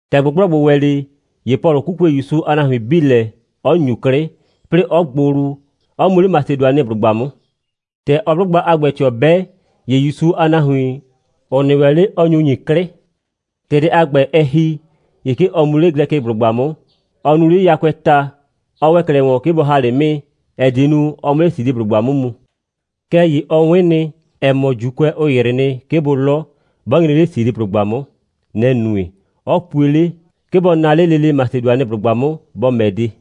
‑Tɛ ꞊gbʋgblɔgbʋ ‑wɛ 'le, ‑ye Pɔlʋ 'kukue ‑Yusu a nahuin 'bii lɛ, 'ɔ ‑nyu 'klɩ, 'plɩɩ 'ɔ gbʋ wlu, 'ɔ mu 'le Masedʋanɩblʋgba 'mʋ. ‑Tɛ ɔɔ 'blʋgba a ‑gbɛ ꞊tɩɔ 'bɛ, ‑ye ‑Yusu a nahuin, ‑ʋ nɩ ‑wɛ 'le, ɔ nyu ‑nyi 'klɩ. ‑Tɛ dɛ a ‑gbɛ, ɛ ‑hi, ‑ye 'ke ɔ mu 'le Glɛkɩblʋgba 'mʋ, 'ɔ nuu 'le yakʋɛɛ ta, 'ɔ ‑wɛ 'klɛɛ ‑wɔn, 'ke bɔ ‑ha 'le 'mɩɩ, ‑ɛ die nu, ɔ 'mʋ 'le Siliblʋgba 'mʋ mu. Kɛɛ ‑ye ɔ 'wɩn nɩ, ‑ɛ mɔ, ‑Juukʋɛ ‑yrɩ nɩ, 'ke bʋ 'lɔ, ('bɔ nyre 'le Siliblʋgba 'mʋ.) Nɛ‑ nue, 'ɔ pue 'le, 'ke bɔ naa 'le lele Masedʋanɩblʋgba 'mʋ, bɔ ‑mɛ de.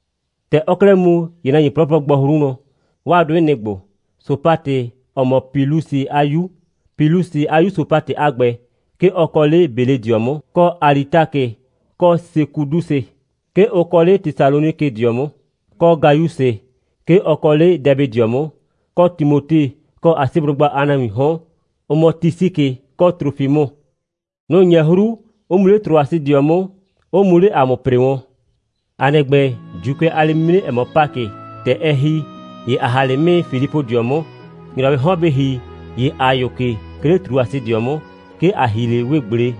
‑Tɛ ɔɔ 'klɛɛ mu, ‑ye nahuin 'plɔplɔ gbɔ 'hru wlɔn. 'Waa 'dʋɩ, nɩ‑ ‑gbo: Sopatɛ, ‑ɔ mɔ Pilusɩ a 'yu, Pilusɩ a 'yu Sopatɛ a ‑gbɛ, 'ke ɔ kɔ 'le Beledɩɔ 'mʋ, kɔ Alitakɩ, kɔ Sekudusɩ; 'ke ʋ kɔ 'le Tesalonikɩdɩɔ 'mʋ; kɔ Gayusɩ; 'ke ɔ kɔ 'le Dɛbɩdɩɔ 'mʋ; kɔ Timote, kɔ Asiblʋgba a nahuiin 'hɔn, ‑ʋ mɔ Tisikɩ, kɔ Trofimʋ. Nʋ‑ 'nyɛ 'hru, 'ʋ mu 'le Trʋasɩdɩɔ 'mʋ, 'ʋ mu 'le ‑a mʋ ‑pre wɔn. ‑A nɩ ‑gbɛ, ‑Juukʋɛ a lɛ'mimre, ‑ɛ mɔ Pakɩ, ‑tɛ ɛ ‑hi, ‑ye ‑a ‑ha 'le 'mɩɩ Filipʋdɩɔ 'mʋ. ‑Nyrɔwɩɩ ꞊hun bɩ ‑hi, ‑ye ‑a yʋ ke, 'ke 'le Trʋasɩdɩɔ 'mʋ. 'Ke ‑a ‑hi 'le 'wee꞊gble.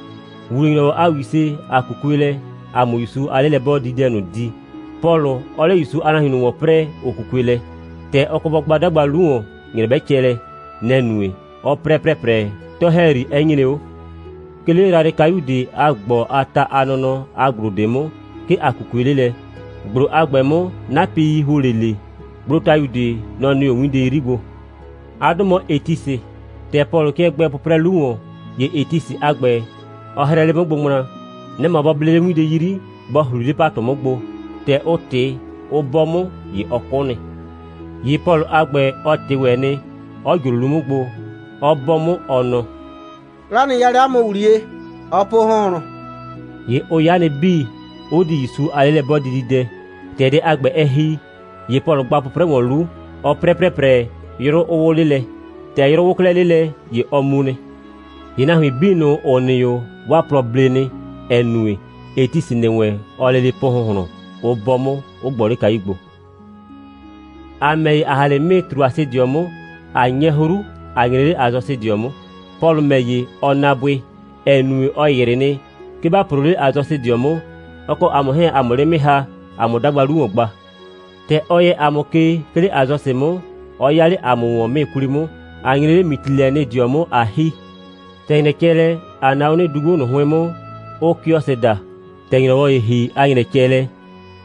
‑Wuwle‑nyrɔwɔ a ‑wise, ‑a 'kukue lɛ, ‑a 'mʋ ‑Yusu a 'lelɛ'bɔɔdididɛ ꞊nʋ di, Pɔlʋ 'ɔɔ 'le ‑Yusu a nahuin ꞊nʋ ‑wɔn 'prɛɛ, ‑ʋ 'kukue lɛ. ‑Tɛ ɔ kɔ bɔ gba 'dagba 'lu ‑wɔn, ‑nyrɛ 'bɛ cɛ lɛ, nɛ‑ nue, 'ɔ 'prɛ ‑prɛprɛ, 'tɔ‑hɛyri 'ɛ nyre 'o. 'Ke 'le yrayrɩkayu ꞊de a ‑gbɔ a ta a nɔnɔ a ‑gblo ꞊de 'mʋ, 'ke ‑a 'kukue 'le lɛ. ‑Gblo a ‑gbɛ 'mʋ, 'napɩi ‑huo 'le ꞊le. Gblotayu ꞊de, nɔ‑ nɩ 'o 'winde 'yri gbo. 'A 'dʋ mɔ Etisɩ. ‑Tɛ Pɔlʋ 'kɩɛ gbɛɛ 'pʋprɛ 'lu ‑wɔn, ‑ye Etisɩ a ‑gbɛ, ɔ hrɛɛ 'le 'mʋ gbo ŋmla. Nɛ‑ mɔ bɔ ble 'le 'winde 'yri, bɔ ‑hli 'le ‑patʋ 'mʋ gbo. ‑Tɛ ʋ ꞊tɩ, ʋ 'bɔ 'mʋ, ‑ye ɔ 'kʋ nɩ. ‑Ye Pɔlʋ a ‑gbɛ, ɔ ꞊tɩ ‑wɛ nɩ, 'ɔ ꞊jro 'lu 'mʋ gbo, 'ɔ 'bɔ 'mʋ, ɔ nɔ: «'Kla nɩ 'ya 'le 'a mʋ ‑wliye. Ɔɔ po ‑hʋnhlʋn.» ‑Ye ʋ 'ya nɩ 'bii, 'ʋ di ‑Yusu a 'lelɛ'bɔɔdididɛ. ‑Tɛ dɛ a ‑gbɛ, ɛ ‑hi, ‑ye Pɔlʋ gba 'pʋprɛ ‑wɔn 'lu, 'ɔ 'prɛ ‑prɛprɛ, 'yrʋ 'ʋ 'wʋ 'le lɛ. ‑Tɛ 'yrʋ 'wʋ 'klɛɛ 'le lɛ, ‑ye ɔ mu nɩ. ‑Ye nahuin 'bii ꞊nʋ, ‑ʋ nɩ 'o, 'waa plɔ ble nɩ, ‑ɛ nue, Etisɩ ‑nɩ wɛn, ɔɔ lele po ‑hʋnhlʋn, 'ʋ 'bɔ 'mʋ, 'ʋ gbɔ 'le kayu gbo. ‑A ‑mɛ ‑ye, ‑a ‑ha 'le 'mɩɩ Trʋasɩdɩɔ 'mʋ, ꞊a 'nyɛ 'hru, ꞊a nyre 'le Asɔsɩdɩɔ 'mʋ. Pɔlʋ ‑mɛ ‑ye, ɔ naa bʋɩ, ‑ɛ nue, ɔ ‑yrɩ nɩ, 'ke ‑ba ‑proo 'le Asɔsɩdɩɔ 'mʋ, ɔ kɔ ‑a mʋ 'hɛɛn, ‑a 'mʋ 'le 'mɩɩ ‑ha, ‑a 'mʋ 'dagba 'lu ‑wɔn gba. ‑Tɛ ɔ yɛ ‑a mʋ ke, 'ke 'le Asɔsɩ 'mʋ, 'ɔ 'ya 'le ‑a mʋ ‑wɔn 'mɩɩ 'kwli 'mʋ, ꞊a nyre 'le Mitilɛnɩdɩɔ 'mʋ, ꞊a ‑hi. ‑Tɛ ‑nyrɛ cɛ lɛ, ꞊a na 'o 'nɩdugbo ꞊nʋ 'hʋɩn 'mʋ, ʋʋ Kiɔsɩ daa. ‑Tɛ ‑nyrɔyrʋwɔ ‑ye ‑hi, 'a ‑nyrɛ cɛ lɛ,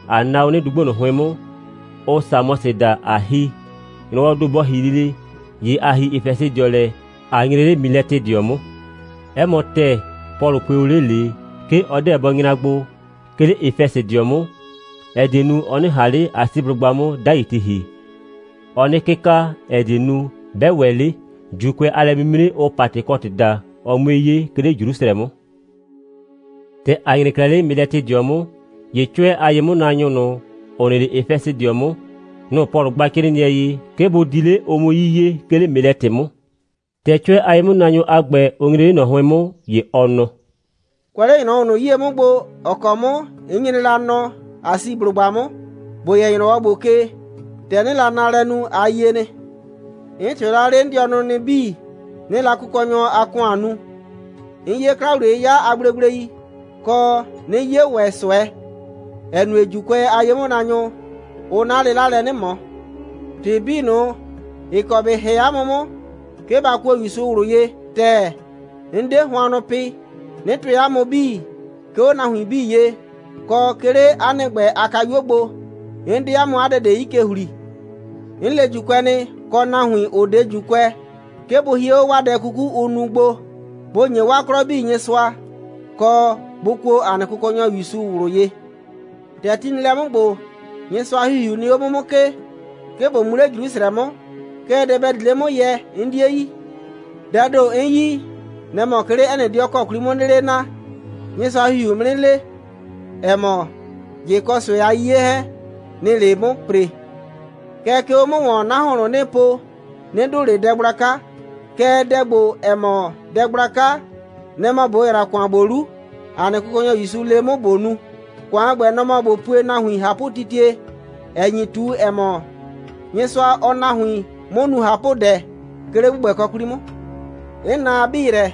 ꞊a na 'o 'nɩdugbo ꞊nʋ 'hʋɩn 'mʋ, ʋʋ Samɔsɩ daa, ꞊a ‑hi. ‑Nyrɔwɔɔ ‑do bɔ ‑hi lele, ‑ye ‑a ‑hi Efɛsɩdɩɔ lɛ, ꞊a nyre 'le Milɛtɩdɩɔ 'mʋ. 'Ɛ mɔ ‑tɛɛ, Pɔlʋ pue o 'le ꞊le, 'ke ɔ 'deɛ bɔ nyra gbo, 'ke 'le Efɛsɩdɩɔ 'mʋ, ‑ɛ die nu, ɔ 'nɩ ꞊han 'le Asiblʋgba 'mʋ 'dai ti ‑hi. Ɔɔ 'nɩ 'kɩka, ‑ɛ die nu, 'bɛ ‑wɛ 'le, ‑Juukʋɛ a lɛ'mimre, ʋʋ Patɩkɔtɩ daa, ɔ 'mue 'ye, 'ke 'le Jrusrɛ 'mʋ. ‑Tɛ ‑a nyre 'klɛɛ 'le Milɛtɩdɩɔ 'mʋ, ‑ye 'cʋɛ a ye'mʋnaanyʋ ꞊nʋ, ‑ʋ nɩ 'le Efɛsɩdɩɔ 'mʋ, nʋ‑ Pɔlʋ gba 'crɩɩnɩɛ ye, 'ke bʋ di 'le, ʋ 'mʋ 'yiye, 'ke 'le Milɛtɩ 'mʋ. ‑Tɛ 'cʋɛ a ye'mʋnaanyʋ a ‑gbɛ, ʋ nyre 'le ꞊nɔ 'hʋɩn 'mʋ, ‑ye ɔ nɔ: «Kʋɛ 'le ‑nyrɔwɔ ꞊nʋ 'yie 'mʋ gbo, ‑ɔ kɔ 'mʋ 'n nyre la nɔ Asiblʋgba 'mʋ, ‑bo yɛ ‑nyrɔwɔ ‑gbo ke, ‑tɛ 'nɩɩ la naalɛ nu, a yie nɩ. 'N ꞊tɩɔ la 'le 'n dɩɔnʋ nɩ 'bii, 'nɩɩ la Kʋkɔnyɔ a ‑kʋan nu. 'N 'ye 'kla‑wliye'yɩya a gblegblei, kɔ, 'nɩ 'ye ‑wɛ ꞊sʋɛ, ‑ɛ nue, ‑Juukʋɛ a ye'mʋnaanyʋ, ʋʋ 'na 'lɩla lɛ 'nɩ ꞊mɔ. ‑Tɩ 'bii ꞊nʋ, ‑ɩ kɔ ‑bɩ ‑hɛ 'a mʋ 'mʋ, 'ke ba kuo ‑Yusu ꞊wlʋ ye ‑tɛɛ, 'n 'de hʋannʋ pɩ, 'nɩ tʋɩ 'a mʋ 'bii, 'ke 'o nahuin 'bii ye, kɔ 'ke 'le 'a nɩ ‑gbɛ a kayuo gbo. 'N 'de 'a mʋ 'a dɛ ꞊de 'yi ke ‑hli. 'N le ‑Juukʋɛ nɩ, kɔ nahuin, ‑ʋ 'de ‑Juukʋɛ, 'ke bʋ hie 'o 'waa dɛ 'kuku, ʋʋ nu gbo, bʋ ‑nye 'waa 'klɔ 'bii Nyɩsʋa, kɔ, bʋ kuo ‑a nɩ Kʋkɔnyɔ ‑Yusu ꞊wlʋ ye. ‑Tɛ ti nɩ lɛ 'mʋ ‑gbo, Nyɩsʋa a ‑Hihiu nɩ 'o 'mʋ 'mʋ ke, 'ke ꞊bo mu 'le Jrusrɛ 'mʋ, kɛɛ, dɛ ‑bɛ di 'le 'mʋ yɛ, 'n 'die yi. Dɛɛ ‑do 'n yi, nɛ‑ mɔ, 'ke 'le 'ɛ nɩ 'dɩɔ ‑kɔ 'kwli 'mʋ 'nɩɩ 'le naa, Nyɩsʋa a ‑Hihiuu 'mʋ 'nɩ le, ‑ɛ mɔ, ꞊jɩ kɔ ꞊sʋɛ a 'yiye 'hɛɛn, nɩ‑ɩ 'le 'mʋ ‑pre. Kɛɛ, 'ke 'o 'mʋ ‑wɔn, 'na ‑hʋnhlʋn, 'nɩɩ po, 'nɩ dʋʋ ꞊le dɛ gblaka. Kɛɛ, dɛ ‑gbo, ‑ɛ mɔ dɛ gblaka, nɛ‑ mɔ ꞊bo ‑yra ‑kʋan ‑gbo 'lu, ‑a nɩ Kʋkɔnyɔ ‑Yusu le 'mʋ ꞊bo nu. ‑Kʋan a ‑gbɛ, nɔ‑ mɔ ꞊bo pue nahuin ꞊hapʋtitie, ‑ɛ nyi ꞊tu, ‑ɛ mɔ, Nyɩsʋa, ɔɔ nahuin 'mʋ nu ꞊hapʋdɛ, 'ke 'le ‑gbʋgbɛkɔ 'kwli 'mʋ. 'N na a 'bii yrɛ,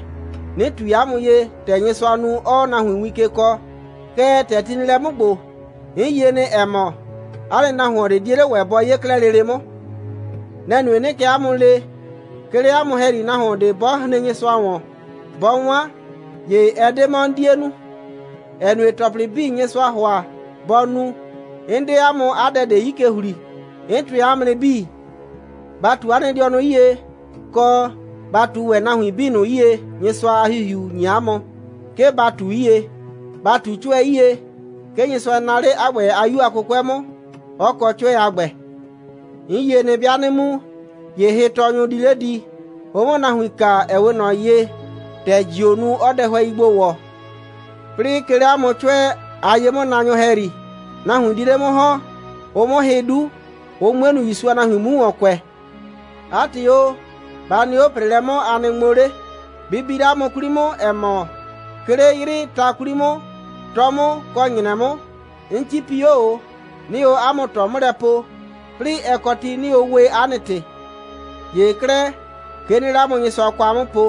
'nɩ ꞊tui 'a mʋ ye, ‑tɛ Nyɩsʋaa nu, 'ɔɔ nahuin win ke kɔɔ. Kɛɛ, ‑tɛ ti nɩ lɛ 'mʋ ‑gbo, 'n yie nɩ, ‑ɛ mɔ, 'a nɩ nahuon ꞊de 'die 'le ‑wɛ bɔ 'ye 'klɛɛ lele 'mʋ. Nɛ‑ nue, 'nɩɩ kɛ 'a mʋ le, 'ke 'le 'a mʋ ‑hɛyri, nahuon ꞊de 'bɔ hren Nyɩsʋa ‑wɔn, 'bɔ 'wan, ‑ye ɛ 'de 'mɔ 'n 'die nu, ‑ɛ nue, ‑tɔplɩ 'bii, Nyɩsʋaa ‑hʋa bɔ nu, 'n 'de 'a mʋ 'a dɛ ꞊de 'yi ke ‑hli, 'n tʋɩ 'a mʋ nɩ 'bii. Ba ꞊tu 'a nɩ dɩɔnʋ 'yie, kɔ, ba ꞊tu ‑wɛ nahuin 'bii ꞊nʋ 'yie, Nyɩsʋa a ‑Hihiu ‑nyi 'a mʋ, 'ke ba ꞊tu 'yie. Ba ꞊tu 'cʋɛ 'yie. 'Ke Nyɩsʋa naa 'le 'a ‑gbɛ a 'Yu a 'kʋkʋɛ 'mʋ, 'ɔ kɔ 'cʋɛ a ‑gbɛ. 'N yie nɩ, 'bɩa 'nɩ mu, ‑ye hɩtɔɔnyʋ di 'le di, ʋ 'mʋ nahuin kaa, ‑ɛ 'we ꞊nɔ ye, ‑tɛ ‑jioo nu, 'ɔɔ dɛhʋɛi gbo ‑wɔ. 'Plɩɩ 'ke 'le 'a mʋ 'cʋɛ a ye'mʋnaanyʋ ‑hɛyri, nahuin di 'le 'mʋ ‑hɔn, ʋ 'mʋ hɩ 'du, ʋ 'mue nu, ‑Yusu a nahuin 'mu ‑wɔn kʋɛ. 'A ‑tɩ o, ba nɩ 'o ‑preelɛ 'mʋ, a nɩ ŋmo 'le. Bɩ bi 'le 'a mʋ 'kwli 'mʋ, ‑ɛ mɔ, 'ke 'le 'yrɩɩ ta 'kwli 'mʋ, 'tɔ 'mʋ kɔ ‑nyrɛ 'mʋ, 'n 'cipi 'o ꞊o, 'nɩɩ o 'a mʋ ꞊tɔ 'mʋ lɛ po, 'plɩɩ, 'ɛ kɔ ti, 'nɩɩ o we 'a nɩ ‑tɩ. ‑Ye 'klɛɛ, 'ke 'nɩɩ 'le 'a mʋ Nyɩsʋa kwa 'mʋ po,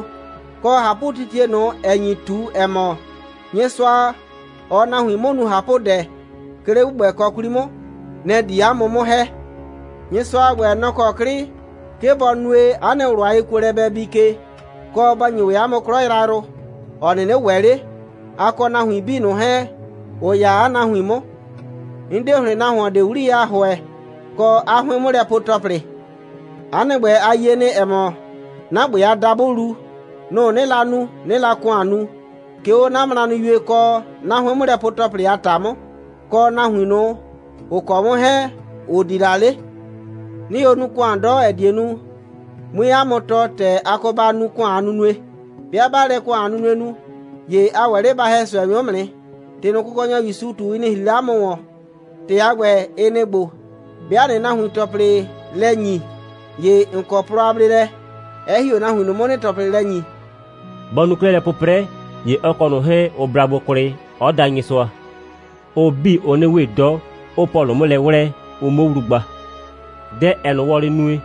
kɔ ꞊hapʋtitie ꞊nʋ, ‑ɛ nyi ꞊tu, ‑ɛ mɔ, Nyɩsʋa, ɔɔ nahuin 'mʋ nu ꞊hapʋdɛ, 'ke 'le ‑gbʋgbɛkɔ 'kwli 'mʋ, nɛ‑ di 'a mʋ 'mʋ ‑hɛ. Nyɩsʋa a ‑gbɛ, nɔ‑ kɔ 'klɩ, 'ke bɔ nue, 'a nɩ ꞊wlʋ a yekuolɛ bɛ bii ke, kɔ, bɔ ‑nyi ‑wɛ 'a mʋ 'klɔ yrayrʋ, ‑ɔ 'nɩnɩ ‑wɛ 'le, a kɔ nahuin 'bii ꞊nʋ 'hɛɛn, ‑ʋ 'ya 'a nahuin 'mʋ. 'N 'de ‑hlɩn nahuon ꞊de 'wliyɛ a ‑hʋɛ, kɔ 'a 'hʋɩn'mʋlɛpue‑tɔplɩ. 'A nɩ ‑gbɛ, a yie nɩ, ‑ɛ mɔ, 'na ‑gbɛ a dabʋlu, nʋ‑ 'nɩɩ la nu, 'nɩɩ la ‑kʋan nu, 'ke 'o 'na mranɩyue kɔ 'na 'hʋɩn'mʋlɛpue‑tɔplɩ a ‑ta 'mʋ, kɔ nahuin ꞊nʋ, ‑ʋ kɔ 'mʋ 'hɛɛn, ‑ʋ di la 'le. 'Nɩɩ o nu ‑kʋan 'dɔ, ‑ɛ die nu, 'mue 'a mʋ tɔɔ, ‑tɛ a kɔ ba nu ‑kʋan a nunue. 'Bɩa ꞊baa lɛ ‑kʋan a nunue nu, ‑ye ‑a ‑wɛ 'le ‑ba ‑hɛ ꞊sʋɛnyʋ 'mʋ nɩ. ‑Tɩ ꞊nʋ, Kʋkɔnyɔ ‑Yusu ꞊tu, ɩ nɩ ‑hri 'le ‑a mʋ ‑wɔn. ‑Tɩ a ‑gbɛ, ɩ nɩ‑ ‑gbo: 'Bɩa ꞊nɩɩ nahuin ‑tɔplɩ lɛ ‑nyi, ‑ye ‑n kɔ plɔ a bleelɛ, 'ɛ ‑hi 'o nahuin ꞊nʋ 'mʋ, ‑nɩɩ ‑tɔplɩ lɛ ‑nyi.» Bɔ nu 'klɛɛ lɛ 'pʋprɛ, ‑ye ɔ kɔ ꞊nʋ 'hɛɛn, ʋ bla gbo kwlɩ, 'ɔ da Nyɩsʋa. Ʋ 'bii, ʋʋ 'nɩ we 'dɔ, 'ʋʋ Pɔlʋ 'mʋ lɛ 'wlɛɛ, ʋ 'muo wlu gba. Dɛ, ‑ɛɛ ꞊nʋ wɔlɩ nue,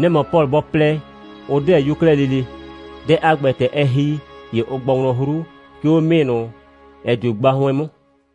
nɛ‑ mɔ Pɔlʋ bɔ plɛ, ʋ 'deɛ bʋ 'yo 'klɛɛ lele. Dɛ a ‑gbɛ, ‑tɛ ɛ ‑hi, ‑ye ʋ gbɔ wlɔn 'hru, 'ke 'o 'mɩɩ ꞊nʋ, ‑ɛ dio gba 'hʋɩn 'mʋ.